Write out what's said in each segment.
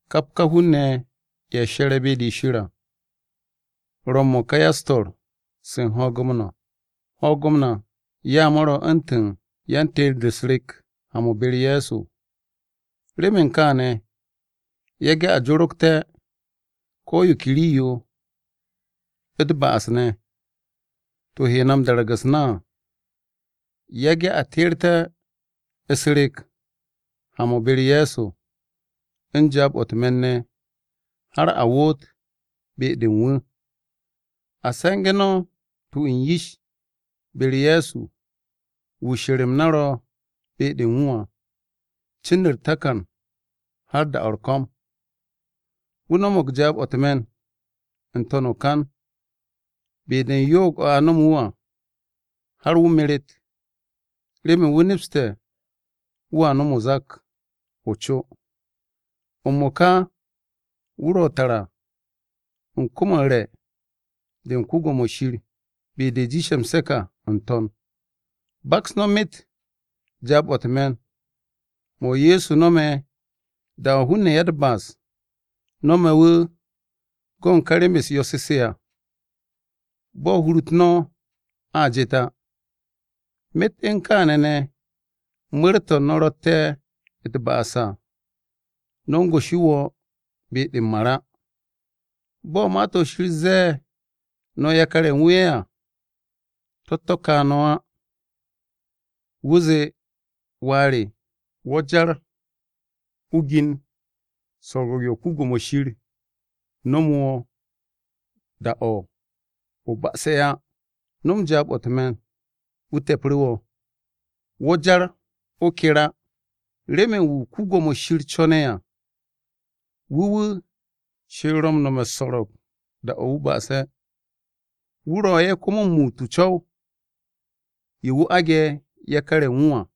Kap ka hun-ne̱, ye̱ she̱re̱ be-de Shir à, ro̱ m-mo̱ka ya-u̱s-to̱r se u̱n ho̱o̱g-m na. Ho̱o̱g-m na ya mo̱ ro̱ u̱ntu̱n ya-teer-de u̱s-rek ha-mo̱ be-u̱r Ye̱so. Remen kaane̱, yage̱ a jorogte̱ ko̱ yo ke rii-yo, u̱t-ba'as ne̱, to̱ he na dagar u̱s-na à. Yage̱ a teerte̱ u̱s-rek ha-mo̱ be-u̱r Ye̱so u̱n jaab-o̱ u̱t-me̱n ne̱ har a woot be-de u̱n wu̱. A se̱nge̱ no̱ tu u̱n yish be-u̱r Ye̱so wu̱ she̱r-m na ro̱ be-de u̱n wu̱ à, cin u̱r-takan har da-o̱ u̱r-ko̱m. Wu̱ no̱mo̱g jaab-o̱ u̱t-me̱n n-to̱n o-kan be-de u̱n yo'og o̱ a no̱mu̱ wu̱ à, har wu̱ meret remen wu̱ nepste̱ wu̱a no̱m o-zak o-co. M-mo̱ka wu̱ ro̱ tara u̱n kom-o u̱r-re̱ de u̱n Shir, be-de jiishe̱ m-se̱k à n-To̱n. Baks no̱ myet jaab-o̱ u̱t-me̱n mo̱ Ye̱so no̱me̱ da-o̱ hun-ne̱ ya-u̱t-ba'as no̱me̱ wu̱ go̱n ká rem-u̱s yo̱-se à, bo̱ no̱a ruut u̱r-hur á. Myet u̱n kaane̱ ne̱, mu̱r-to̱ no̱ ro̱tte̱ u̱t-ba'as à, no̱ u̱n goshi wo̱ be-de m-mar á. Bo̱ Ma-to̱ Shir ze̱e̱ no̱ yakar-ye̱ u̱n wu̱ ye̱ à, to̱-to̱ ka no̱ á. Wu̱ zee, “Wà re, wo̱ jar o gin so̱ro̱g yo Yawe nomo wo̱ da-o̱ o̱ ba'ase̱ á. No̱m jaab-o̱ u̱t-me̱n, wu̱ te̱pru̱ wo̱. Wo̱ jar o ker á, remen wu̱ Yawe co̱ne̱ à, wu̱ wu̱, Shir ro̱ m-nome̱ u̱s-so̱ro̱g da-o̱ wu̱ ba'ase̱. Wu̱ ro̱ ye̱ komo m-muut o-co̱w ye̱ wu̱ aage̱ yakar-ye̱ u̱n wu̱ à.”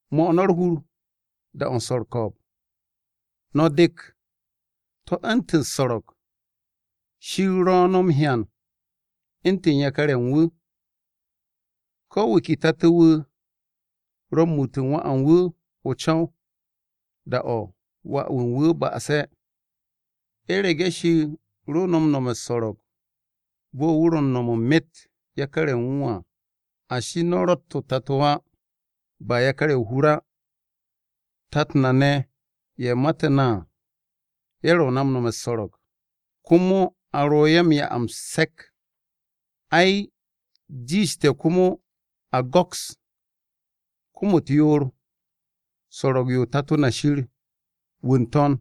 'Mo̱ no̱ u̱r-hur da-o̱ u̱n swo̱ u̱r-ko̱o̱b, no̱ dek to̱ u̱ntu̱n u̱s-so̱ro̱g; Shir ro̱ no̱ m-hyan u̱ntu̱n yakar-ye̱ u̱n wu̱. Ko̱ wu̱ ke tato wu̱ ro̱ m-muut u̱n wà u̱n wu̱ o-co̱w da-o̱ wà u̱n wu̱ ba'ase̱. U̱rege̱ Shir ro no̱ m-no̱me̱ u̱s-so̱ro̱g, bo̱ wu̱ ro̱ u̱n no̱me̱ u̱n myet yakar-ye̱ u̱n wu̱ á, ashi no̱ ro̱tt o-tato á, ba yakar-ye̱ o-hur á. Tat na ne̱ ye̱ mate̱ na à, ye̱ ro̱ na u̱n nome̱ u̱s-so̱ro̱g, komo a ro̱ ye̱ m-'ya m-se̱k. Ay, jiishte̱ komo a go̱ks kom-u̱t yoor so̱ro̱g-yo Tato na Shir wu̱ n-To̱n,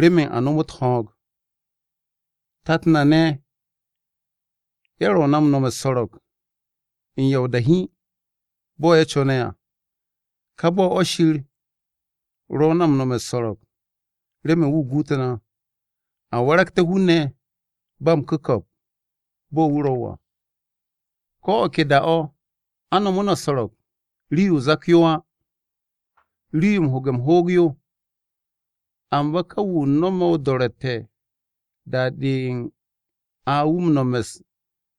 remen a nomot ho̱o̱g. Tat na ne̱ ye̱ ro̱ na m-nome̱ u̱s-so̱ro̱g u̱n ya o-da hiin bo̱ ye̱ co̱ne̱ à, ká bo̱ o̱ Shir ro̱ na no̱me̱ u̱s-so̱ro̱g remen wu̱ guut na, a waragté̱ hun-ne̱ ba m-ku̱ko̱p bo̱ wu̱ ro̱ à. Ko̱ o̱ ke da-o̱ a nomo na u̱s-so̱ro̱g, rii-yo o-zak yo á, rii-yo u̱n ho̱ge̱ m-hoog yo. Amba ka wu̱ no̱me̱ o-do̱ro̱tte̱ da-de a wu̱ m-nome̱ u̱n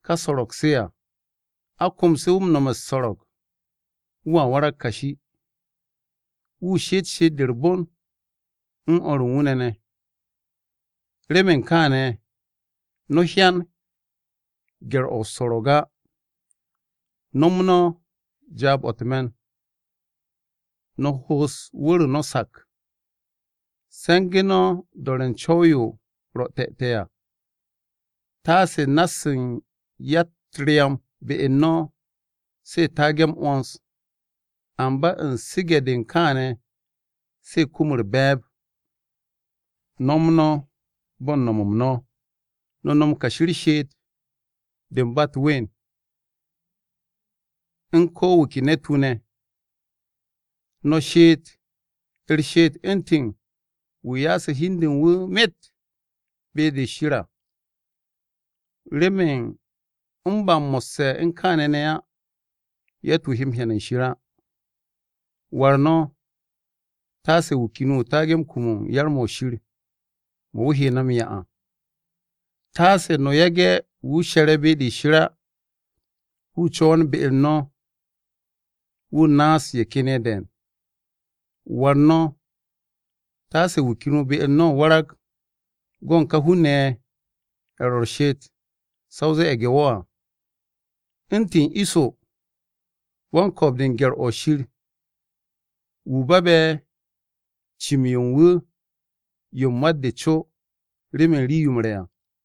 ka so̱ro̱g-se à, a komse̱ wu̱ m-nome̱ u̱s-so̱ro̱g, wu̱a warag kashi, wu̱ she'et she'et-de u̱r-bon u̱n o̱r u̱n wu̱ ne̱ ne̱. Remen kaane̱, no̱ hyan gye̱r-o̱ o-so̱ro̱g á. No̱m no̱ jaab-o̱ u̱t-me̱n, no̱ ho'os wu̱r-o no̱ sak. Se̱ngu̱ no̱ u̱n do̱re̱ u̱n co̱w-yo ro̱ te̱te̱ à, tasse na-se u̱n ya-u̱t-ryam be-u̱r no̱ se taage̱ m-'wo̱ns, amba u̱n su̱ge̱-de u̱n kaane̱ se kum u̱r-be̱e̱b. No̱m no̱ bo̱ u̱n no̱m-m no̱, no̱ no̱m kashi u̱r-she'et de u̱n ba u̱t-ween u̱n ko̱ wu̱ ke ne̱t-wu̱ ne̱. No̱ she'et u̱r-she'et u̱ntu̱n wu̱ ya'ase̱ hi u̱n de u̱n wu̱ myet be-de Shir à. Remen m-ba mo̱sse̱ u̱n kaane̱ ne̱ á yatt-wu̱ he hyan u̱n Wan-Ko̱yan á. War no̱, taase wu̱ ken wu̱ taage̱ kum u̱n yar-mo̱ Shir mo̱ wu̱ he na m-'ya à. Taase no̱ yage̱ wu̱ she̱re̱ be-de Shir á wu̱ co̱wo̱n be-u̱r no̱ wu̱ naas ye̱ ken ye̱ de̱e̱n. War no̱, taase wu̱ ken wu̱ be-u̱r no̱ warag go̱ u̱n ka hun-ne̱ ye̱ ro̱ u̱r-she'et sa o zee ye̱ge̱-wo̱ à, u̱ntu̱n Iso wan-ko̱o̱b-de gye̱r-o Shir. Wu̱ babe̱ cim-yo u̱n wu̱ yo u̱n mat-de co remen rii-yo m-re̱ à.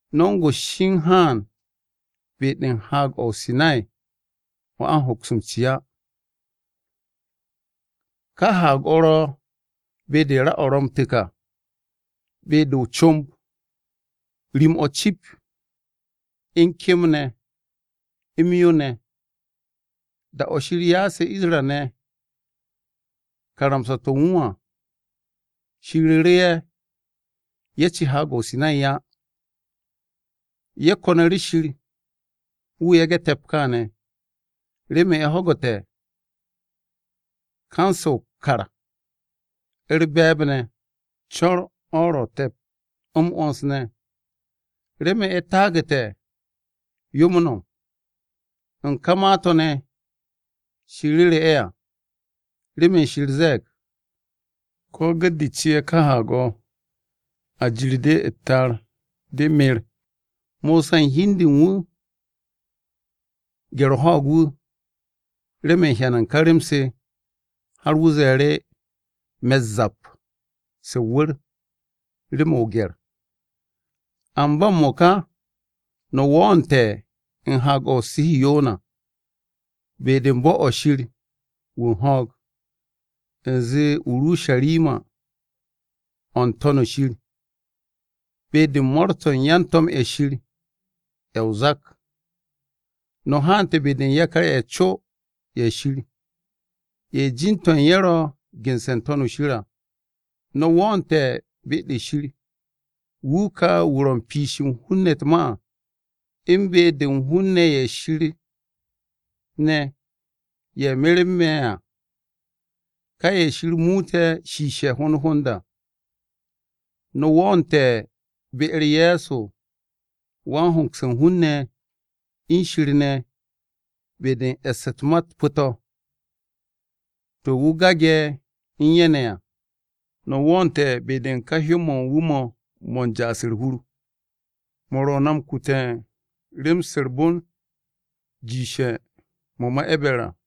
No̱ u̱n goshi u̱n haan be-de u̱n Haag-o̱ o-Sinay o̱ a hoks m-ci á. Ka haag-o̱ ro̱ be-de ra-o̱ ro̱ m-tu̱k à, be-de o-comb rim-o̱ cip, u̱n kem ne̱ m-yo ne̱. Da-o̱ Shir ya'ase̱ Isra-ne̱ karamsa-to̱ u̱n wu̱ à, Shir ru̱ru̱ ye̱, ye̱ ci Haag-o̱ o-Sinay á. Ye̱ ko̱nu̱ru̱ Shir wu̱ yage̱ te̱p kaane̱, remen ye̱ ho̱gu̱te̱ kan-se o-kar u̱r-be̱e̱b ne̱, co̱r-o̱ ro̱ te̱p, m-'wo̱ns ne̱. Remen ye̱ taagu̱te̱ yo m-no̱m u̱n ka ma-to̱ ne̱, to̱ Shir ru̱ru̱ ye̱ à. Remen Shir ze̱e̱g, “Ko̱ gu̱t-de ci ka haag-o̱, a jir-de u̱t-ta'ar, de mer.” Mosa u̱n hi u̱n de u̱n wu̱ gye̱r-o ho̱o̱g wu̱ remen hyan u̱n ka rem-se har wu̱ ze̱e̱ru̱, “Me̱ u̱s-zap se o-wu̱r rem o-gye̱r.” Amba m-mo̱ka, no̱ wo̱o̱nte̱ u̱n Haag-o̱ o-Urusharima, be-de u̱n bo̱-o̱ Shir wu̱ u̱n ho̱o̱g, u̱nze o-Urusharima o̱ n-To̱n shir, be-de mo̱o̱r-to̱ u̱n yan-to̱m-ye̱ Shir ye̱ o-zak. No̱ hante̱ be-de u̱n yakar-ye̱ co ye̱ Shir, ye̱ jin-to̱ u̱n ye̱ ro̱ gense̱ n-To̱n shir à. No̱ wo̱o̱nte̱ be-de Shir, Wu̱ ka wu̱ ro̱ u̱n piishe̱ u̱n hun-ne̱ u̱t-ma à, u̱n be-de u̱n hun-ne̱ ye̱ Shir ne̱ ye̱ merme̱ à, ka ye̱ Shir muute̱ shiishe̱ hond hond à. No̱ wo̱o̱nte̱ be-u̱r Ye̱so wan-hongse̱ u̱n hun-ne̱ u̱n Shir ne̱ be-de u̱n e̱ss u̱t-ma pu̱-to̱, to̱ wu̱ gage̱ u̱n ye̱ ne̱ à. No̱ wo̱o̱nte̱ be-de ka hyó-mo̱ u̱n wu̱ mo̱ mo̱ u̱n ja'as u̱r-hur, mo̱ ro̱ na m-kute̱ u̱n rem-se u̱r-bon jiishe̱ mo̱ ma E̱ber à.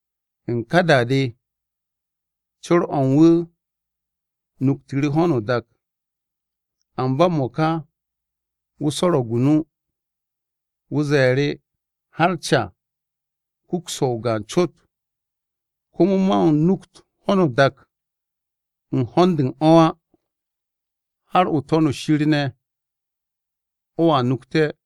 U̱n ka da-de, co̱r-o̱ u̱n wu̱ nuktu̱ru̱ ho̱no o-dak, amba m-mo̱ka wu̱ swo̱ro̱g o-nu, wu̱ ze̱e̱ru̱, “Har ca kuks so̱ o-gaan cot, komo man nukt ho̱no o-dak u̱n ho̱n-de u̱n o̱ á. Har o-To̱n shir ne̱ o̱a nukte̱.”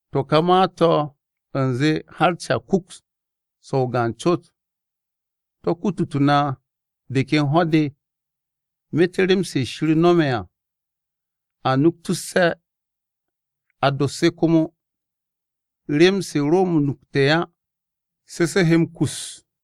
To̱ ka ma-to̱ u̱nze, “Har ca kuks so̱ o-gaan cot,” to̱ kututu̱ na de ken ho̱-de myet rem-se Shir no̱me̱ à, a nuktusse̱ a dos se komo. Rem-se ro m-nukte̱ à, se se he m-kus.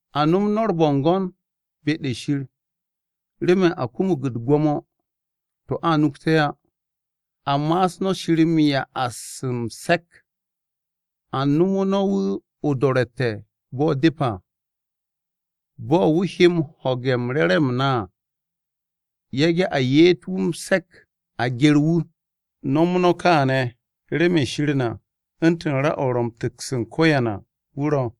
A no̱m no̱ u̱r-bo̱ngo̱n be-de Shir remen a kumug u̱t-gwo̱mo to̱ a nukte̱ á. A ma'asu̱ no̱ Shir m-ya'as m-se̱k, a nomo no̱ wu̱ o-do̱ro̱tte̱ bo̱ depe̱ à, bo̱ wu̱ he m-ho̱ge̱ u̱n re̱re̱m-m na à. Yage̱ a ye'et wu̱ m-se̱k a gye̱r wu̱. No̱m no̱ kaane̱, remen Shir na u̱ntu̱n ra-o̱ ro̱ m-tu̱ks u̱n ko̱yan à wu̱ ro̱.